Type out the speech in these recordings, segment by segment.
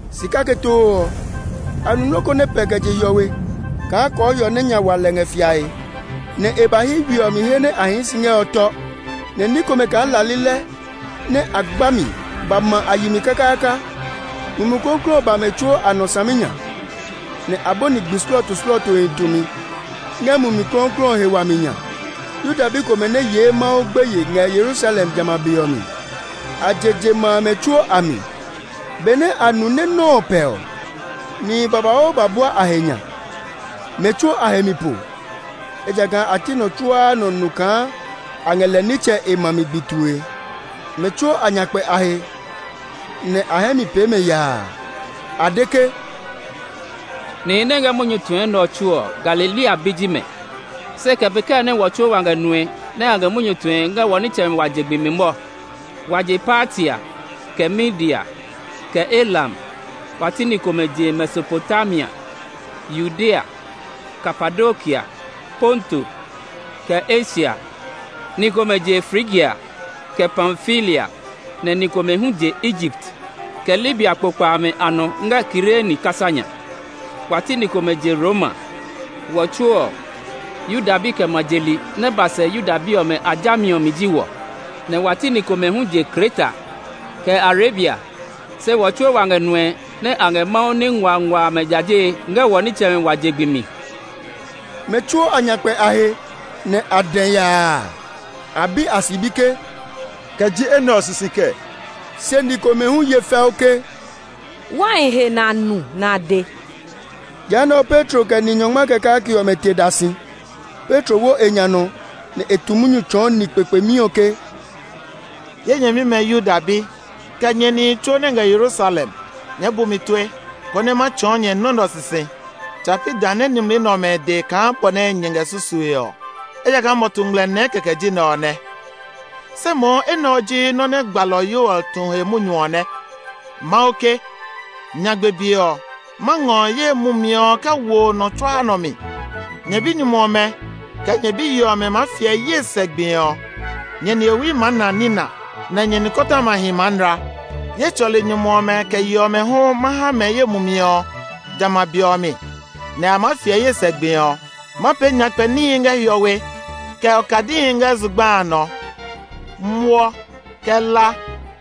Si kake too ɔ, a nu nɔ́ ko nɛ pɛ kɛ je hiɔwe kaa kɔɔhiɔ nɛ nya wa lɛ ngɛ fiae; nɛ e ba hyi we ɔ mi he nɛ a hii si ngɛ ɔ tɔ. Nɛ ní komɛ kaa la lilɛ nɛ a gba mi ba ma a yi mi kakaaka. Mumi Klɔuklɔu ɔ ba mɛ tsuo a nɔ saminya, nɛ a bɔni gbi slɔɔtoslɔɔtohi tumi ngɛ Mumi Klɔuklɔu ɔ he wami nya. Yuda bi komɛ nɛ yee Mawu gbeye ngɛ Yerusalem jamɛ a be ɔ mi. A je je ma amɛ tsuo a mi. Benɛ a nu nɛ nɔ́ ɔ pɛ ɔ, nihi babauu ba bua a he nya. Mɛ tsuo a he mi po; ejakaa a ti nɔ tsuaa nɔ nu kaa a ngɛ lɛ nitsɛ e ma mi gbi tue. Mɛ tsuo a nya kpɛ a he, nɛ a hɛ mi pee mɛ yaa. A de ke, “Nihi nɛ ngɛ munyu tue nɛ ɔ tsuo ɔ, Galilea bi ji mɛ! Se kɛ pee kɛɛ nɛ wɔ tsuo wa ngɛ nue nɛ a ngɛ munyu tue ngɛ wɔ nitsɛmɛ wa je gbi mi mɔ? Wa je Partia, kɛ Media, kɛ Elam; wa ti ni komɛ je Mesopotamia, Yudea, Kapadokia, Ponto, kɛ Asia; ni komɛ je Frigia, kɛ Pamfilia; nɛ ni komɛ hu je Egipt, kɛ Libia kpokpa amɛ a nɔ ngɛ Kirene kasa nya. Wa ti ni komɛ je Roma. Wɔ tsuo ɔ, Yuda bi kɛ ma je li nɛ ba sɛ Yuda bi jami ɔ mi ji wɔ; nɛ wa ti ni komɛ hu je Kreta, kɛ Arabia; se wɔ tsuo wa ngɛ nue nɛ a ngɛ Mawu ní nguangua amɛ jajee ngɛ wɔ nitsɛmɛ wa je gbi mi!” Mɛ tsuo a nya kpɛ a he, nɛ a dɛ yaa. A bi a sibi ke, “Kɛ ji enɛ ɔ sisi kɛɛ?” Se ni komɛ hu ye fɛu ke, “Wai he nɛ a nu nɛ a de.” Jehanɛ ɔ, Petro kɛ ni nyɔngma kɛ kake ɔmɛ te da si; Petro wo e nya nɔ nɛ e tu munyu tsɔɔ ni kpekpemi ɔ ke, “Ye nyɛmimɛ Yuda bi, kɛ nyɛ nihi tsuo nɛ ngɛ Yerusalem, nyɛɛ bu mi tue, konɛ ma tsɔɔ nyɛ nɔ́ nɛ ɔ sisi. Tsa pi dã nɛ ni mli nɛ ɔmɛ de kaa bɔ nɛ nyɛ ngɛ susue ɔ, ejakaa mɔtu ngmlɛ nɛɛ kɛkɛ ji nɛ ɔ nɛ. Se mohu enɛ ɔ ji nɔ́ nɛ gbalɔ Yoel tu he munyu ɔ nɛ: ‘Mawu ke, Nyagbe be ɔ, ma ngɔ ye Mumi ɔ kɛ wo nɔ tsuaa nɔ mi. Nyɛ binyumu ɔmɛ, kɛ nyɛ biyi ɔmɛ maa fiɛ ye sɛ gbi ɔ; nihewi maa na nina, nɛ nikɔtɔmahi maa nla. Ye tsɔli nyumu ɔmɛ kɛ yi ɔmɛ hu, ma ha mɛ ye Mumi ɔ jamɛ a be ɔ mi, nɛ a maa fiɛ ye sɛ gbi ɔ. Ma pee nyakpɛ níhi ngɛ hiɔwe, kɛ okadihi ngɛ zugba a nɔ. Muɔ, kɛ la,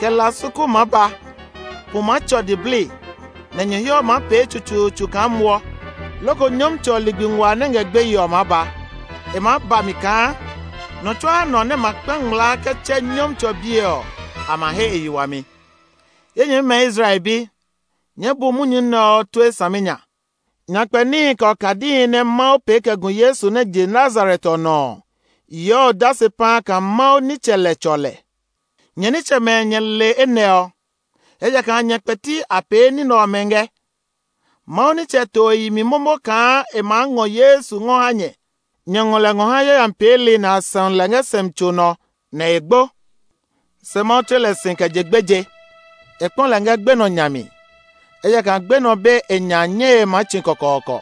kɛ la su ku maa ba. Pu maa tsɔ diblii, nɛ nyɔhiɔ ma pee tsutsuutsu kaa muɔ loko Nyɔmtsɛ ɔ ligbi nguaa nɛ ngɛ gbeye ɔ maa ba. E maa ba mi kaa nɔ tsuaa nɔ nɛ ma kpa ngmlaa kɛ tsɛ Nyɔmtsɛ ɔ biɛ ɔ, a ma he e yi wami.’ “Ye nyɛmimɛ Israel bi, nyɛɛ bu munyu nɛ ɔ tue saminya! Nyakpɛ níhi, kɛ okadihi nɛ Mawu pee kɛ gu Yesu nɛ je Nazaret ɔ nɔ ɔ yeɔ odase paa kaa Mawu nitsɛ lɛ tsɔ lɛ. Nyɛ nitsɛmɛ nyɛ le enɛ ɔ, ejakaa nyɛ kpɛti a pee ni nɛ ɔmɛ ngɛ. Mawu nitsɛ to e yi mi momo kaa e maa ngɔ Yesu ɔ ngɔ ha nyɛ. Nyɛ ngɔ lɛ ngɔ ha yayami peeli nɛ a sɛu lɛ ngɛ sɛumi tso nɔ, nɛ e gbo. Se Mawu tle lɛ si kɛ je gbeje; e kpɔ lɛ ngɛ gbenɔ nya mi, ejakaa gbenɔ be e nya nyɛe maa tsi kɔkɔɔkɔ.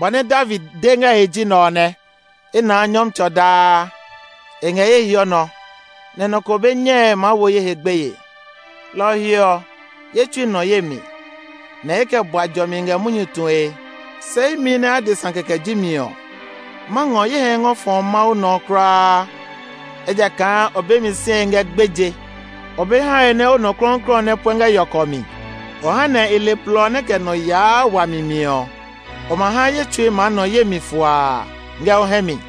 Bɔ nɛ David de ngɛ e he ji nɛ ɔ nɛ: ‘I naa Nyɔmtsɛ ɔ daa; e ngɛ ye hiɔ nɔ, nɛ nɔ ko be nyɛe maa wo ye he gbeye. Lɔ ɔ he ɔ, ye tsui nɔ ye mi, nɛ i kɛ bua jɔmi ngɛ munyu tue; se imi nɛ adesa kɛkɛ ji mi ɔ, ma ngɔ ye hɛ ngɔ fɔ Mawu nɔ kulaa. Ejakaa o be mi sie ngɛ gbeje; o be hae nɛ o nɔ klɔuklɔu ɔ nɛ puɛ ngɛ yɔkɔ mi. O ha nɛ i le blɔ nɛ kɛ nɔ yaa wami mi ɔ. O ma ha ye tsui maa nɔ ye mi fuaa ngɛ o hɛ mi.’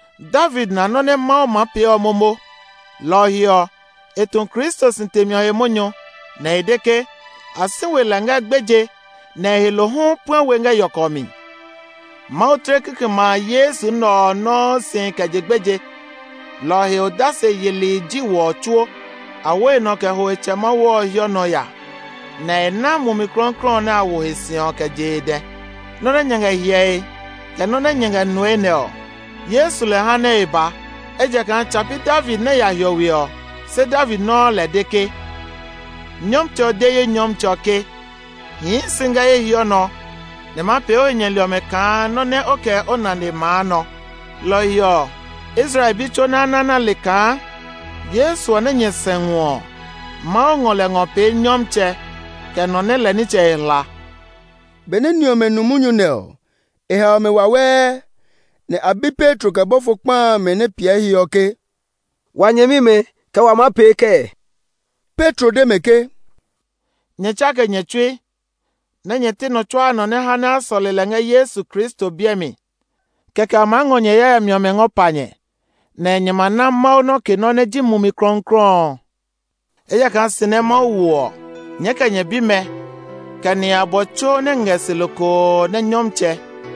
David na nɔ́ nɛ Mawu maa pee ɔ momo, lɔ ɔ he ɔ, e tu Kristo si temi ɔ he munyu, nɛ e de ke, ‘A si we lɛ ngɛ gbeje, nɛ e he lo hu puɛ we ngɛ yɔkɔ mi.’ Mawu tle kikɛmɛ a Yesu nɛ ɔ nɔuu si kɛ je gbeje; lɔ ɔ he odase yeli ji wɔ tsuo. A wo e nɔ kɛ ho e Tsɛ Mawu ɔ hiɔ nɔ ya, nɛ e ná Mumi Klɔuklɔu nɛ a wo he si ɔ kɛ je e dɛ. Nɔ́ nɛ nyɛ ngɛ hyɛe, kɛ nɔ́ nɛ nyɛ ngɛ nue nɛ ɔ, Yesu lɛ ha nɛ e ba. Ejakaa tsa pi David nɛ ya hiɔwe ɔ, se David nɔuu lɛ de ke, ‘Nyɔmtsɛ ɔ de ye Nyɔmtsɛ ɔ ke, Hii si ngɛ ye hiɔ nɔ, nɛ ma pee o he nyɛli ɔmɛ kaa nɔ́ nɛ o kɛ o nane maa nɔ.’ “Lɔ ɔ he ɔ, Israel bi tsuo nɛ́ a na nɛ a le kaa Yesu ɔ nɛ nyɛ sɛu ɔ, Mawu ngɔ lɛ ngɔ pee Nyɔmtsɛ, kɛ nɔ nɛ lɛ nitsɛ e hla!” Benɛ ni ɔmɛ nu munyu nɛ ɔ, e hao mɛ wawɛɛ, nɛ a bi Petro kɛ bɔfo kpa amɛ nɛ piɛ e he ɔ ke, “Wa nyɛmimɛ, kɛ wa maa pee kɛɛ?” Petro de mɛ ke, “Nyɛ tsake nyɛ tsui, nɛ nyɛ ti nɔ tsuaa nɔ nɛ ha nɛ a sɔle lɛ ngɛ Yesu Kristo biɛ mi, kɛkɛ, a maa ngɔ nyɛ he yayami ɔmɛ ngɔ pa nyɛ, nɛ nyɛ ma na Mawu nɔke nɔ́ nɛ ji Mumi Klɔuklɔu ɔ. Ejakaa si nɛ Mawu wo ɔ, nyɛɛ kɛ nyɛ bimɛ, kɛ nihi abɔ tsuo nɛ ngɛ se lokoo nɛ Nyɔmtsɛ,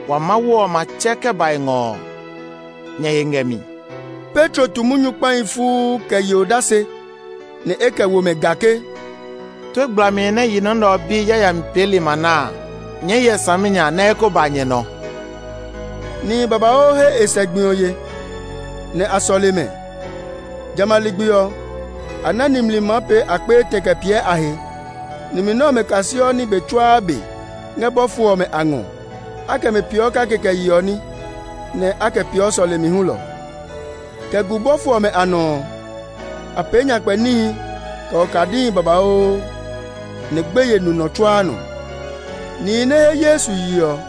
wa Mawu ɔ ma tsɛ kɛ ba e ngɔ ɔ nyɛ he ngɛ mi.” Petro tu munyu kpahi fuu kɛ ye odase, nɛ e kɛ wo mɛ ga ke, “Tue gblami nɛ yi nɔ nɛ ɔ bi yayami peeli ma na a, nyɛɛ hyɛ saminya nɛ e kó ba nyɛ nɔ.” Nihi babauu he e sɛ gbi ɔ ye, nɛ a sɔle mɛ. Jamɛ a ligbi ɔ, a na nimli maa pee akpe etɛ kɛ piɛ a he. Nimli nɛ ɔmɛ kaseɔ ní be tsuaa be ngɛ bɔfo ɔmɛ a ngɔ; a kɛ mɛ peeɔ kake kɛ yeɔ ní, nɛ a kɛ peeɔ sɔlemi hulɔ. Kɛ gu bɔfo ɔmɛ a nɔ ɔ, a pee nyakpɛ níhi, kɛ okadihi babauu, nɛ gbeye nu nɔ tsuaa nɔ. Nihi nɛ he Yesu ye ɔ tsuo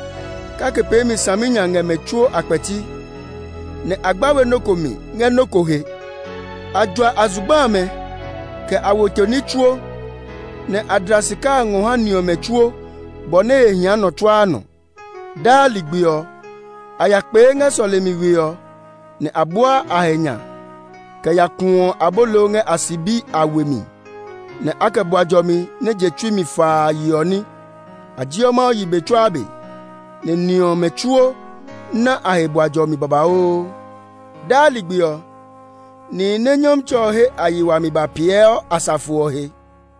kake peemi saminya ngɛ mɛ tsuo a kpɛti, nɛ a gba we nɔ ko mi ngɛ nɔ ko he. A jua a zugba amɛ, kɛ a weto ní tsuo, nɛ a dla sika a ngɔ ha ni ɔmɛ tsuo bɔ nɛ he hia nɔ tsuaa nɔ. Daa ligbi ɔ, a ya kpee ngɛ sɔlemi we ɔ, nɛ a buaa a he nya kɛ ya kuɔ abolo ngɛ a sibi a we mi, nɛ a kɛ bua jɔmi nɛ je tsui mi faa yeɔ ní. A jeɔ Mawu yi be tsuaa be, nɛ ni ɔmɛ tsuo ná a he bua jɔmi babauu. Daa ligbi ɔ, nihi nɛ Nyɔmtsɛ ɔ he a yi wami ba piɛɔ asafo ɔ he.